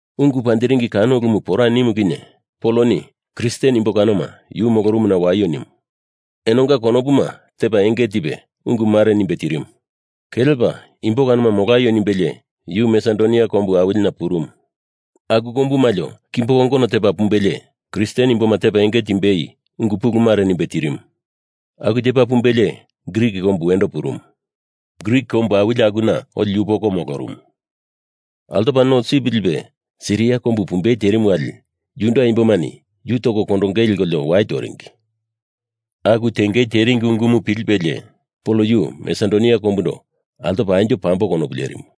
Ungu panjiringi kano ulumu pora nimu kinye Poloni Kristen imbo kanoma yu molorumuna waio nimu. Enonga konopuma tepa enge tipe ungu mare nimbe tirimu. Kelepa imbo kanoma molaio nimbelie yu Masedonia kombu awilina purumu. Aku kombu malio kimbo kongono tepa pumbelie Kristen imboma tepa enge timbei ungu pulumumare nimbe tirimu. Aku tepa pumbelie Grik kombu wendo purumu. Grik kombu awili akuna oli yupoko molorumu. Altopa no sip lipe Siria kombu pumbei terimu wali Juda imbomani yu toko kondongei lekolio wai toringi. Aku tengei teringi ungumu pilipelie Pol yu Masedonia kombundo altopo anjo pambo konopu lerimu.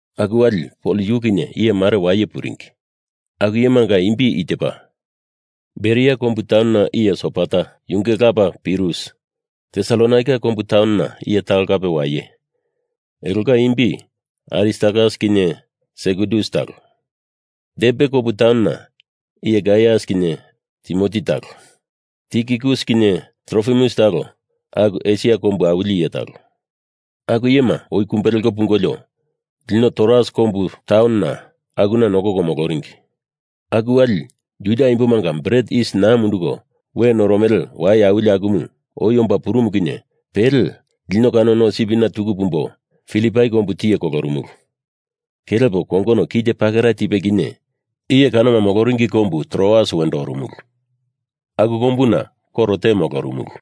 Aku wali Pol yu kinye iye mare waye puringi. Aku iyemanga imbi i tepa: Beria kombu taunona iye Sopater, yunge lapa Pirus. Tesalonaika kombu taunona iye talo kape waye, elonga imbi Aristarkas kinye Sekundus talo. Derbe kombu taunona iye Gaius kinye Timoti talo, Tikikus kinye Trofimus talo, aku Esia kombu awili iye talo. Aku iyema oi kumbe leko pungolio lino Troas kombu taunona akuna nokoko moloringi. Aku wali Juda imbomanga bret yis naa munduko we noromele wai awili akumu oi omba purumu kinye pele lino kano no sipina tuku pumbo Filipai kombu tiye kolorumulu. Kelepo kongono kite pakera tipe kinye iye kanoma moloringi kombu Troas wendo orumulu. Aku kombuna koro te molorumulu.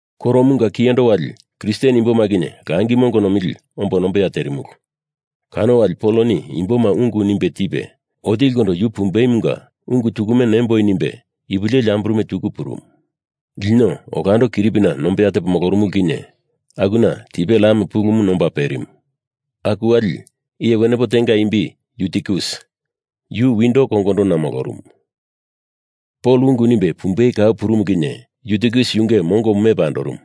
Koromunga kiyendo wali Kristen imboma kinye langi mongo nomili ombo nombeya terimulu. Kano wali Poloni imboma ungu nimbe tipe otilikondo yu pumbeimunga ungu tukume nemboi nimbe ipu leli amburume tuku purumu. Lino olando kiripina nombeya tepo molorumulu kinye akuna tipe lam pulumu nomba perimu. Aku wali iye wenepo tenga imbi Yutikus, yu windo kongondona molorumu. Pol ungu nimbe pumbei kau purumu kinye Yutikus yunge mongomu mepa andorumu.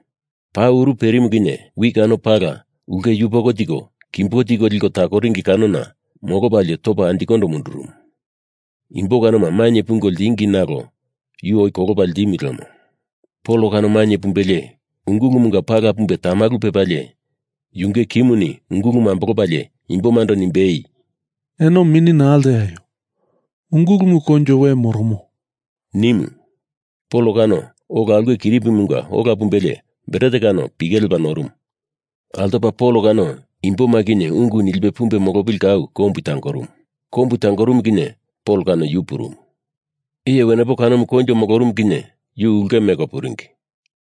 Paa uru perimu kinye wi kano pala ulke yupoko tiko kimbo tiko liko takoringi kanona molopalie topa anjikondo mundurumu. Imbo kanoma mainye pungo ltingi nalo yu oi kolopa ltimu lemo. Pol kano mainye pumbelie ungulumunga pala pumbe tamalu pepalie yunge kimuni ungulumu ambolopalie imbomando nimbei, “Eno mini naa lteaio. Ungulumu koinjo we moromo,” nimu. Pol kano ola ulke kiripimunga ola pumbelie bret kano pike lepa norumu. Altopa Pol kano imboma kinye ungu nilipe pumbe molopili kau kombu tangorumu. Kombu tangorumu kinye Pol kano yu purumu. Iye wenepo kanomu koinjo molorumu kinye yu ulke meko puringi.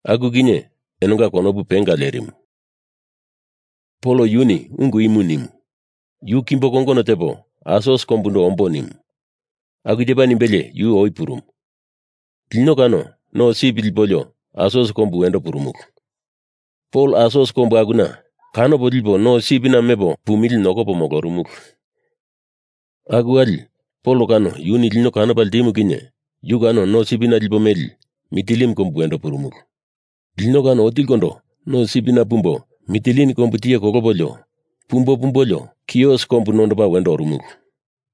Aku kinye enonga konopu penga lerimu. Pol yuni ungu imu nimu, yu kimbo kongono tepo Asos kombundo ombo nimu. Aku tepa nimbelie yu oi purumu. Lino kano no sip lipolio Asos kombu wendo purumulu. Pol Asos kombu akuna kanopo lipo no sipina mepo pumili nokopo molorumulu. Aku wali Pol kano yuni lino kanopa ltimu kinye yu kano no sipina lipo meli Mitilin kombu wendo purumulu. Lino kano otilikondo no sipina pumbo Mitilin kombu tiye kolopolio pumbo pumbolio Kios kombu nondopo wendo orumulu.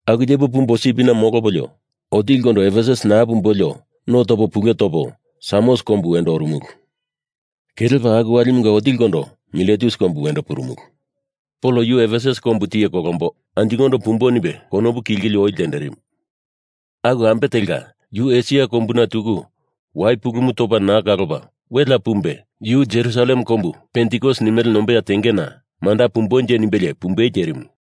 Aku tepo pumbo sipina molopolio otilikondo Efesus naa pumbolio no topo pule topo Samos kombu wendo orumulu. Kelepa aku walimunga otilikondo Miletus kombu wendo purumulu. Pol yu Efesus kombu tiye kolombo anjikondo pumbo nimbe konopuna kilkili oi ltenderimu. Aku ambe telka yu Esia kombuna tuku wai pulumu topa naa kalopa welea pumbe yu Jerusalem kombu pentikos nimele nombeya tengena manda pumbonje nimbelie pumbei terimu.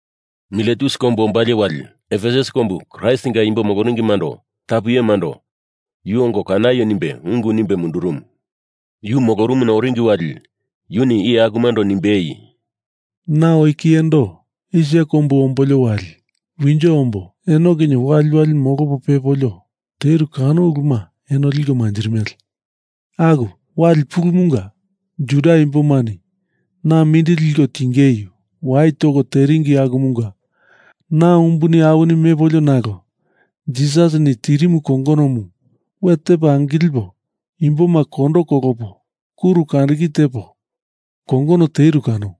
Miletus kombu ombalie wali Efesus kombu Kraistinga imbo moloringimando tapu iyemando yu ongo kanaio nimbe ungu nimbe mundurumu. Yu molorumuna oringi wali yuni iye akumando nimbei, “Na oi kiyendo Esia kombu ombolio wali winjo ombo eno kinye waliwali molopo pepolio teru kano uluma enoni liko manjirimele. Aku wali pulumunga Juda imbomani na mindili liko tingei wai toko teringi akumunga na umbuni awini mepolio nalo Jisasini tirimu kongonomu we tepo angilipo imboma kondo kolopo kuru kandiki tepo kongono teru kano.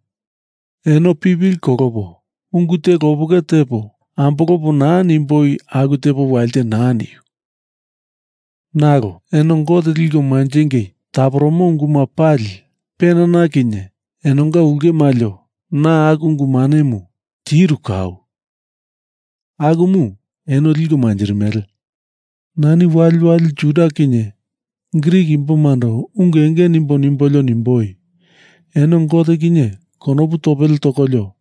Eno pipili kolopo ungu te lopeke tepo ambolopo naa nimboi aku tepo walite naa niu. Nalo eno Gote liko manjingei taporomo unguma pali penana kinye enonga ulke maliona aku ungu manemu tiru kau. Akumu eno liko manjirimele. Nani waliwali Juda kinye Grik imbomando ungu enge nimbo nimbolio nimboi, eno Gote kinye konopu topele tokolio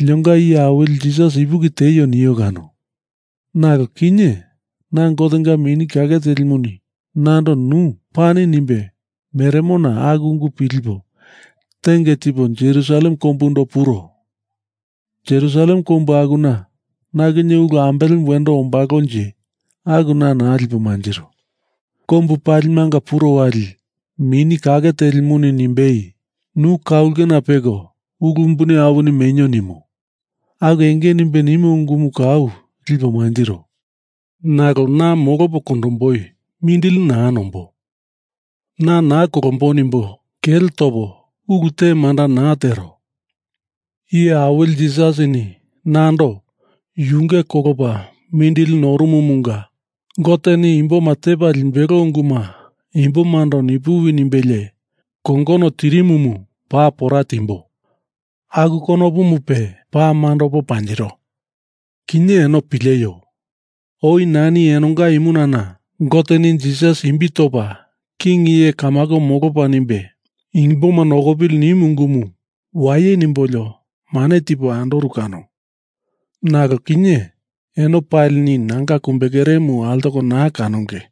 linonga Iye Awili Jisas ipuki tieio nio kano. Nalo kinye na Gotenga Mini Kake Telimuni nando nu pani nimbe meremona aku ungu pilipo tenge tipo Jerusalem kombundo puro. Jerusalem kombu akuna na kinye ulu ambelemu wendo ombalonje aku na naa lipo mantiro. Kombu palimanga puro wali Mini Kake Telimuni nimbei, nu ka ulke peko ulu umbuni awini menio nimo. Aku enge nimbe nimo ungumu kau lipo mantiro. Nalo na molopo kondomboi mindili naa nombo, na naa kolombo nimbo kele topo ulu te manda naa tero. Iye Awili Jisasini nando yunge kolopa makilerimumunga Goteni imboma tepa limbelo unguma imbomando nipuwi nimbelie kongono tirimumu paa pora timboi. Aku konopumupe paa mandopo panjiro. Kinye eno pileio. Oi nani enonga imunana Goteni Jisas imbi topa king iye kamako molopa nimbe imboma nokopili nimu ungumu waye nimbolio mane tipo andoru kano. Nalo kinye eno palini nanga kumbekeremu altoko naa kanonge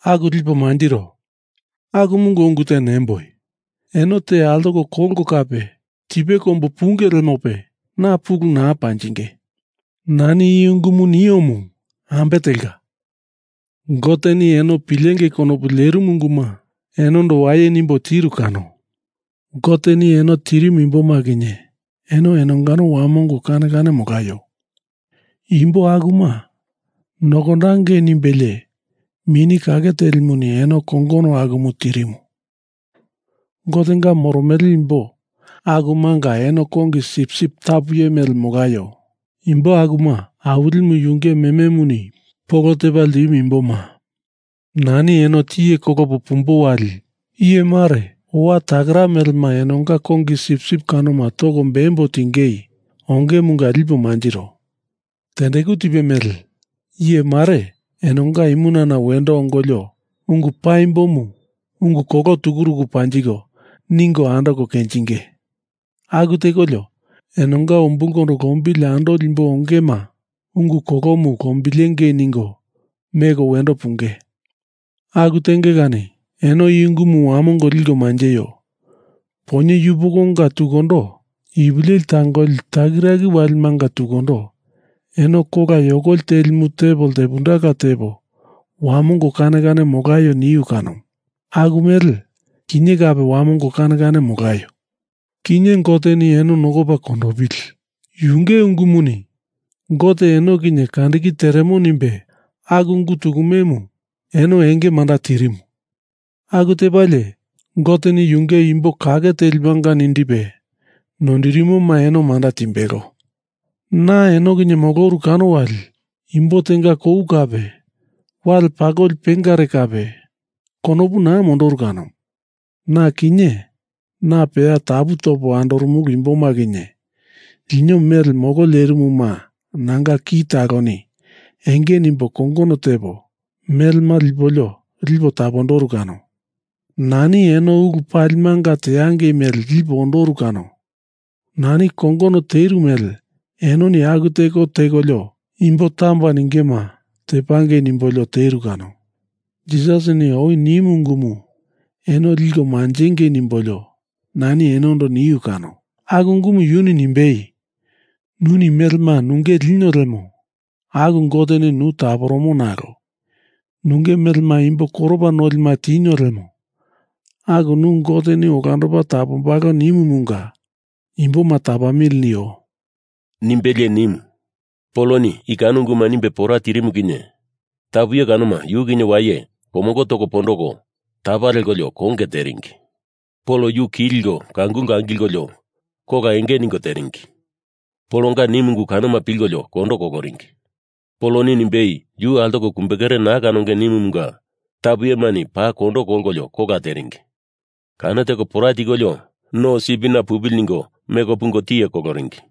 aku lipo mantiro. Akumunga ungu te nemboi, Eno te altoko kolko kape tipe kombu punge lemope na pulu naa panjinge. Nani i ungumu niomu ambe telka, Goteni eno pilengei konopu lerimu unguma enondo waye nimbo tiru kano. Goteni eno tirimu imboma kinye eno enongano wamongo kane kane molaio. Imbo akuma nokondangei nimbelie Mini Kake Telimuni eno kongono akumu tirimu. Gotenga moromele imbo akumanga eno paa kongi sip sip tapu iye mele molaio. Imbo akuma Awilimu yunge mememuni polo tepa ltimu imbomanga. Nani eno tiye kolopo na pumbo wali iye mare owa takera melema enonga kongi sipsip kanoma toko bembo tingei ongemunga lipo mantiro. Tendeku tipe mele iye mare enonga imunana wendo ongolio ungu paimbomu ungu kolo tukuruku panjiko ningo andoko kenjinge. Aku tekolio enonga umbulkondo lombili andoli imbo ongema ungu kolomu lombilengei ningo meko wendo punge. Aku tenge kani eno i ungumu wamongo liko manjeio. Poinye yupokonga tukundo ipu leli tangoli takiraki walimanga tukundo eno kola yokoli telimu tepo ltepundela tepo wamongo kane kane molaio niu kano. Aku mele kinye kape wamongo kane kane molaio. Kinye Goteni eno nokopa kondopili. Yunge ungumuni Gote eno kinye kandiki teremo nimbe aku ungu tukumemu eno enge manda tirimu. Aku tepalie Goteni yunge imbo kake telimanga nindipe noindirimoma eno manda timbelo. Na eno kinye moloru kano wali imbo tenga kou kape wale pakoli pengare kape konopu naa mondoru kano. Na kinye na peya tapu topo andorumulu imboma kinye, lino mele molo lerimuma nanga ki taloni enge nimbo kongono tepo melema lipolio lipo tapondoru kano. Nani eno ulu palimanga teangei mele lipo ondoru kano. Nani kongono teru mele enoni aku teko tekolio imbo tamba ningema tapangei nimbolio teru kano. Jisasini oi nimu ungumu eno liko manjengei nimbolio nani enondo niu kano. Aku ungumu yuni nimbei, ‘Nuni melema nunge linio lemo aku Goteni nu taporomo nalo nunge melema imbo koropa nolima tinio lemo aku nu Goteni olandopa tapombalo,’ nimumunga imboma tapamili nio,” nimbelie nimu. Poloni i kano unguma nimbe pora tirimu kinye tapu iye kanoma yu kinye waye komongo toko pondoko tapa lekolio konge teringi. Pol yu ki likolio kangulko angilko kola enge ningo teringi. Polonga nimu ungu kanoma pilkolio kondo koloringi. Poloni nimbei yu altoko kumbekere naa kanonge nimumunga tapu iyemani paa kondo kolkolio kola teringi. Kano teko pora tikolio no sipina pupili ningo meko pungo tiye koloringi.